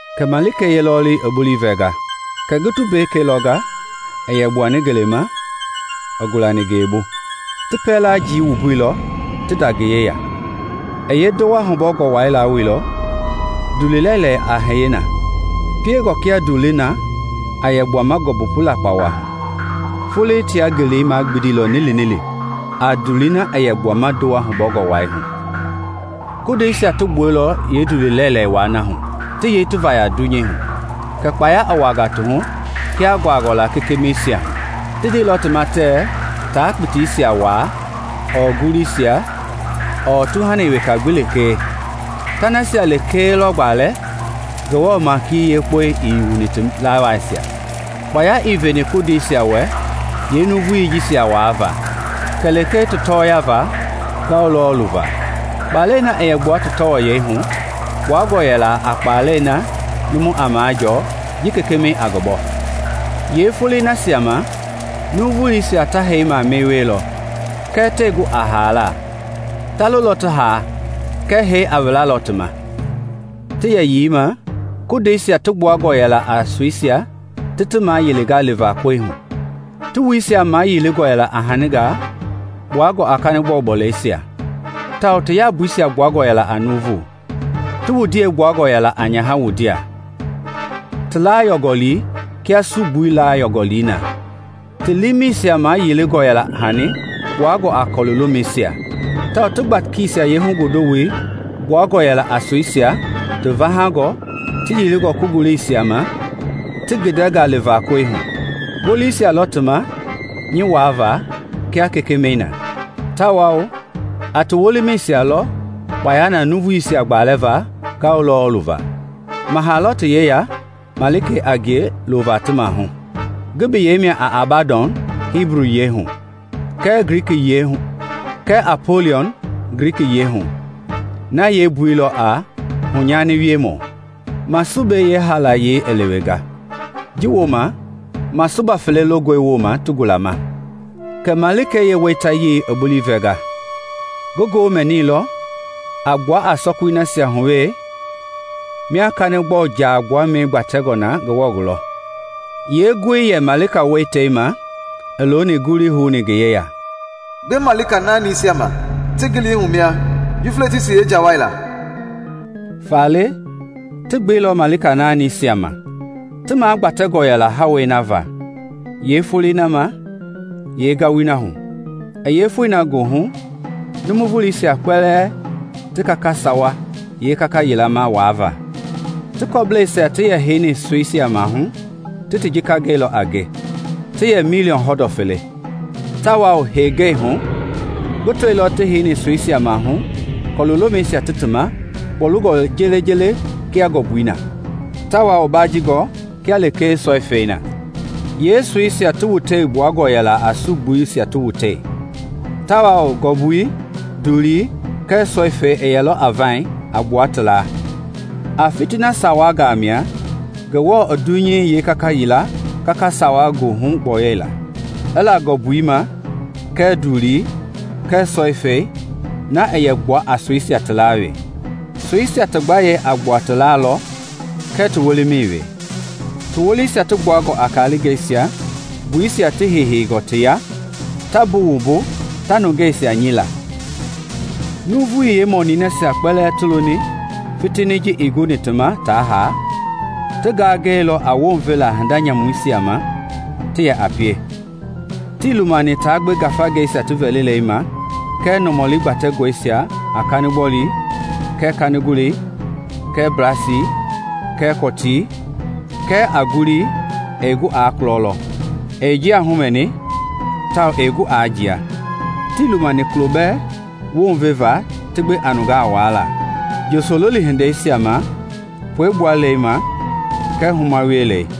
Kɛ malikei yeelɔɔluyei i bulii vɛnga. Kɛ ngi tumbekei lɔnga i yɛ gbuani ngeleima i gulani ngeebu; ti ndɔu-lama jii wumbuilɔ ti da ngi yeya. I yee ndowa hubɔngɔ wai lawoilɔ, ndulu-lɛilɛi wa a hiye na, piengɔ kia ndulii na a yɛ gbuama ngɔmbu pu lakpawa hu; foloi tia ngelei magbindi lɔ nilinili a ndulii na yɛ gbua ndowa hubɔngɔ wai hu. Kondeisia ti gbuailɔ yee ndulu lɛilɛi wai hu ti yei ti vaya dunyei hu, kɛ kpaya i wuaa ti hu kia nguangɔ la kekemɛisia hu. Ti ndeilɔ ti ma tɛ taa kpitiisia waa, ɔɔ nguluisia, ɔɔ tuhani weka gbi lekee; ta nasia lekee lɔ gbalɛ Ngewɔ maiki yeekpɔi ii wuni ti lawaasia. Kpaya ii veni kondeisia wɛ yee nuuvui jisia waa va, kɛ lekee ti tɔɔya va ngawu lɔɔlu va. Kpalɛi na a gbua ti tɔɔyɛi hu kpuangɔ a yɛla a kpaalɛi na numui a majɔɔ ji kekemɛi a ngi bɔ. Yee foloi nasia ma nuuvuisia ta hee mamani wielɔ, kɛɛ tɛɛ gu a haala; ta lolɔ ti haa kɛɛ hee a wilalɔ ti ma. Ti yɛyii ma, kondeisia ti gbuangɔ yɛla a soisia ti ti mayilinga li va koe hu; ti wuisia mayilingɔ yɛla a haningaa kpuangɔ a kanigbɔlu bɔleisia, tawao ti yambui gbuangɔ yɛla nuuvu. Ti wundie gbuangɔ yɛla a nyaha wundie, ti laa yɔungɔli kia sugbui laa yɔungɔli na. Ti liimɛisia mayilingɔ yɛla a hani kpuangɔ a kɔlu-lomeisia, tawao ti gbakisia yee hugondowoi gbuangɔ yɛla a soisia ti vahangɔ ti yilingɔ kongoloisia ma ti gindɛnga liva koe hu. Ngolisia lɔ ti ma nyi wuava la kia kekemɛi na, tawao a ti wolimisia lɔ kpaya na nuuvuisia gbalɛva ngawu lɔɔlu va. Maha lɔ ti yeya malika a ngie i looni ti maahu. Ngi biyei mia a Abadɔn Hibu yie hu, kɛ Apoliɔn Gliki yie hu (na yeembui a “Hunyaniwiemɔ”). Masube yeehaalayei i lewenga; ji woma masuba fele longɔe woma ti gulama. Kɛ malikei yeeweitayei i bulii vɛnga. Ngi ngoo mɛnilɔ a gbua a sɔkui nasia hu wee mia kanigbɔlu jaa gbuamɛi gbatɛngɔ na Ngewɔ gulɔ. Yeengoi yɛ malika weitei ma i looni bulii houni ngi yeya, “Gbe malika naanisia ma ti ngilihu mia Yufletisi yeenjawai la!” Faale ti gbeilɔ malika naanisia ma, ti magbatɛngɔ yɛla hawei na va, yeefoloi na ma, yee ngawui na hu, i yee foi na goohu nuuvuisia kpɛlɛɛ ti gaka sawa yeekaka yila waava. Ti kɔ-bleisia ti yɛ heini soisia maahu ti jika gɛilɔ a nge; ti yɛ miliɔŋ hɔndɔ fele. Tawao hengei hu ngi tɔilɔ ti heini soisia maahu kɔlu lomɛisia ti ti ma kpɔlungɔ jeele kia ngɔmbui na, tawao baajingɔ kia lekee sɔifɛi na. Yeesoisia ti wuteisia gbuangɔ yɛla a sugbuisia ti wutei, tawao ngɔmbui, ndulii kɛɛ sɔifɛi yɛlɔ a vaiŋ a gbua ti laa. A fitina sawangaa mia Ngewɔ i dunyei yeekaka yila kaka sawa goohu gbɔyɔuila: i la ngɔmbui ma kɛɛ ndulii kɛɛ sɔifɛi na yɛ gbua a soisia laa we. Soisia ti gbayei a gbua ti laa lɔ kɛɛ ti wolimɛi we. Ti wolisia ti gbuangɔ a kalingɛisia, nguisia ti heiheingɔ ti ya, ta buwumbu ta nungeisia nyila. Nuuvui yeemɔnui nasia kpɛlɛɛ ti loni fitini ji ii gulani ti ma taa haa ti gangɛilɔ wounveva hinda nyamui nasia ma ti yɛ a pie. Tii lumani ta gbe ngafangeisia ti vɛlila ma kɛɛ nɔmɔlisia kpatɛngɔ a kanigbɔlu, kɛɛ kanigole, kɛɛ blasi, kɛɛ kɔtii, kɛɛ a ngului na ɛɛ kulɔ lɔ, ɛɛ njia humɛni tawao ɛɛ gu a jia. Tii lumani kulo bɛɛ wounveva ti gbe a nungaa waala, njosololi hindeisia ma, puegbualei ma kɛɛ huma wielei.